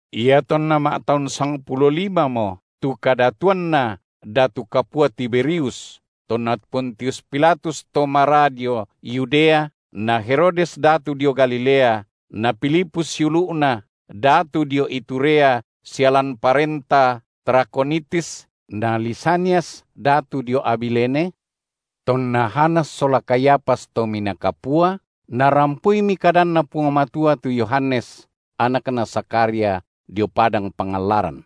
Iatonna ma’taun sangpulo limamo tu kadatuanna datu kapua Tiberius tonna Pontius Pilatus to maraa dio Yudea, na Herodes datu dio Galilea, na Filipus siulu’na, datu dio Iturea sia lan parenta Trakhonitis, na Lisanias datu dio Abilene; tonna Hanas sola Kayafas Tominaa Kapua, narampoimi kadanNa Puang Matua tu Yohanes, anakna Zakharia, dio padang pangallaran.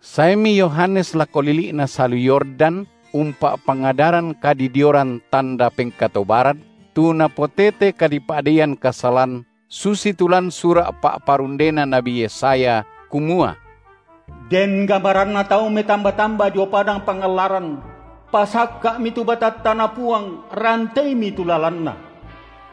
Saemi Yohanes lako lili’na salu Yordan, umpa’pangadaran kadidioran tanda pengkatobaran, tu napotete kadipa’deian kasalan, susi tu lan sura’ pa’parundena nabi Yesaya, kumua: Den gamaranna tau metamba-tamba dio padang pangallaran: Pasakka’mi tu batattaNa Puang, ranteimi tu lalanNa!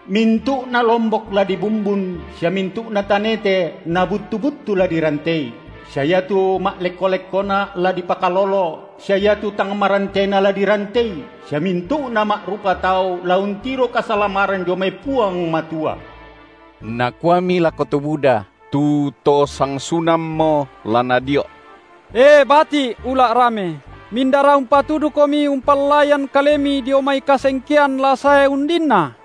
Mintu’na lombok la dibumbun sia mintu’na tanete na buttu-buttu la dirantei, sia iatu ma’lekko-lekkona la dipakalolo, sia iatu tang marantena la dirantei, sia mintu’na ma’rupa tau la untiro kasalamaran dio mai Puang Matua. Nakuami lako to buda, tu to sangsunammo la nadio’; E bati’ ula’ rame, mindara umpatudukomi umpallaian kalemi dio mai kasengkean la sae undinna?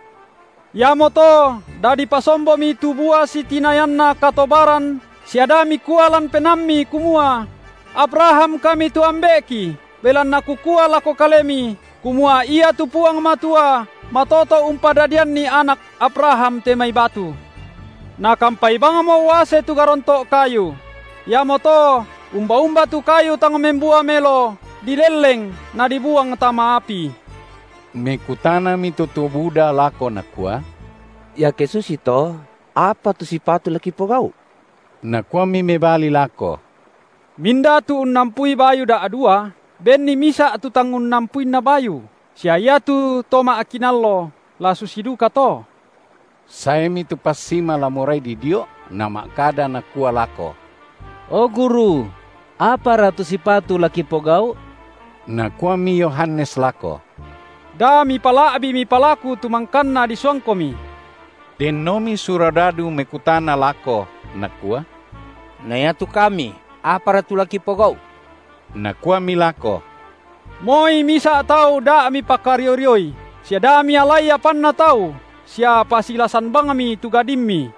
Iamoto dadi pasombomi tu bua sitinayanna katobaran sia da mikua lan penaammi kumua: Abraham kami tu ambe’ki belanna kukua lako kalemi, kumua iatu Puang Matua matoto’ umpadadianni anak Abraham te mai batu. Nakampai bangmo uase tu garonto’ kayu; iamoto umba-umba tu kayu tang membua melo dilelleng nadibuang tama api. Mekutanami tu to buda lako nakua: Iake susito, apa tu sipatu la kipogau’? Nakuami mebali lako: Minda tu unnampui bayu da’dua, benni misa’ tu tang unnampuinna bayu, sia iatu to ma’kinallo, la susi dukato. Saemi tu passima la morai didio’, nama’kada nakua lako: O guru! apara tu sipatu la kipogau’? Nakuami Yohanes lako: Da mipala’bii mipalaku tu mangkanna disuangkomi. Dennomi surodadu mekutana lako, nakua: Na iatu kami, apara tu la kipogau’? Nakuami lako: Moi misa’ tau da mipakario-rioi, sia da mialai apanna tau sia pasilasan bangmi tu gadimmi.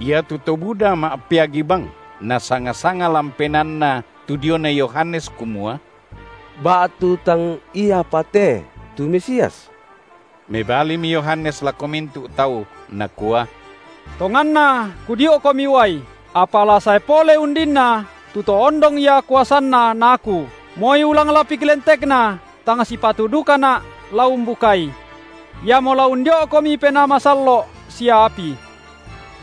Iatu to buda ma’peagi bang, nasanga-sanga lan penaanna tu diona Yohanes kumua: ba’tu tang iapa te tu Mesias. Mebalimi Yohanes lako mintu’ tau, nakua: Tonganna kudio’komi uai, apa la sae pole undinna tu To ondong Ia kuasanNa na aku, moi ulang lapik lentekNa tang sipatu dukana’ la umbukai. Iamo la undio’komi Penaa Masallo’ sia api.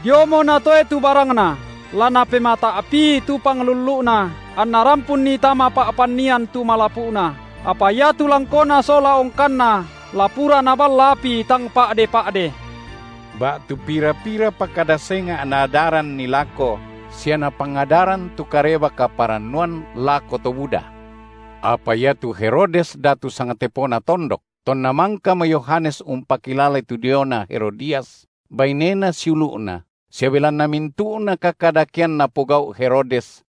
Diomo Natoe tu barangNa, la Napemata’pii tu panglullu’Na anNa rampunni tama pa’pannian tu malapu’na, apa iatu langkona sola ongkanna la pura Naballa api tang pa’de-pa’de. Ba’tu pira-pirapa kada senga’ naadaranni lako sia napangadaran tu Kareba kaparannuan lako to buda. Apa iatu Herodes datu sangtepona tondok, tonna mangkamo Yohanes umpakilalai tu diona Herodias, bainena siulu’na, sia belanna mintu’na kakadakean napogau’ Herodes,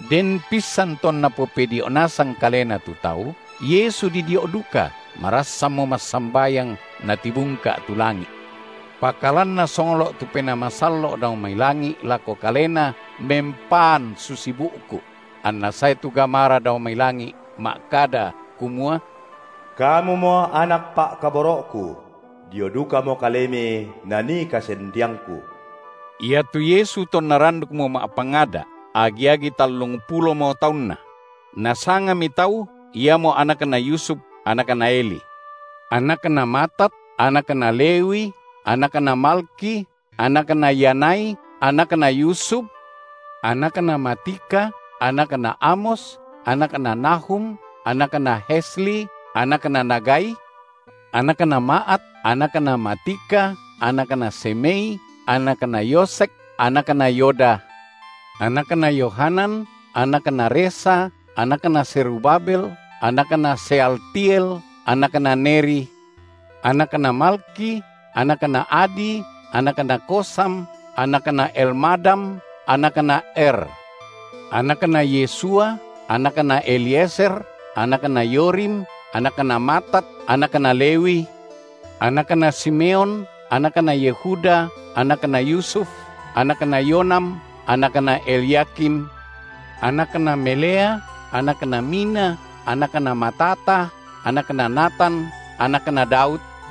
Den pissan tonna popedio’ nasang kalena tu tau, Yesu didio’ duka, marassanmo massambayang, natibungka’ tu langi’. Pakalan Nasonglo’ tu Penaa Masallo’ dao mai langi’ lako Kalena mempaan susi bu’ku’; anna sae tu gamara dao mai langi’ ma’kada kumua: Kamumo Anak Pa’kaboro’Ku; dio dukamo Kalemi nanii kasendeangKu. Iatu Yesu tonna randukmo ma’pangada’, agi-agi tallungpulomo taunNa; nasangami tau, iamo anakna Yusuf, anakna Eli, anakna Matat, anakna Lewi, anakna Malkhi, anakna Yanai, anakna Yusuf; anakna Matica, anakna Amos, anakna Nahum, anakna Hesli, anakna Nagai; anakna Maat, anakna Matica, anakna Semei, anakna Yosekh, anakna Yoda; anakna Yohanan, anakna Resa, anakna Zerubabel, anakna Sealtiel, anakna Neri; anakna Malkhi, anakna Adi, anakna Kosam, anakna Elmadam, anakna Er; anakna Yesua, anakna Eliezer, anakna Yorim, anakna Matat, anakna Lewi; anakna Simeon, anakna Yehuda, anakna Yusuf, anakna Yonam, anakna Elyakim; anakna Melea, anakna Mina, anakna Matata, anakna Natan, anakna Daud;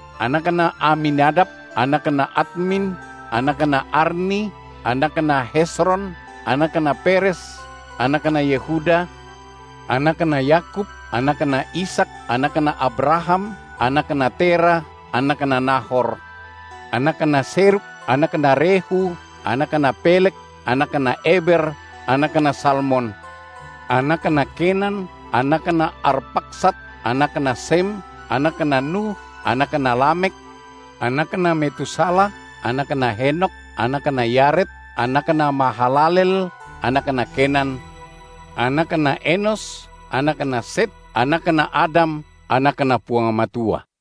anakna Aminadab, anakna Admin, anakna Arni, anakna Hezron, anakna Peres, anakna Yehuda; anakna Yakub, anakna Ishak, anakna Abraham, anakna Terah, anakna Nahor; anakna Serug, anakna Rehu, anakna Peleg, anakna Eber, anakna Salmon; anakna Kenan, anakna Arpakhsad, anakna Sem, anakna Nuh, anakna Lamekh, anakna Metusalah, anakna Henokh, anakna Yared, anakna Mahalaleel, anakna Kenan; anakna Enos, anakna Set, anakna Adam, anakNa Puang Matua.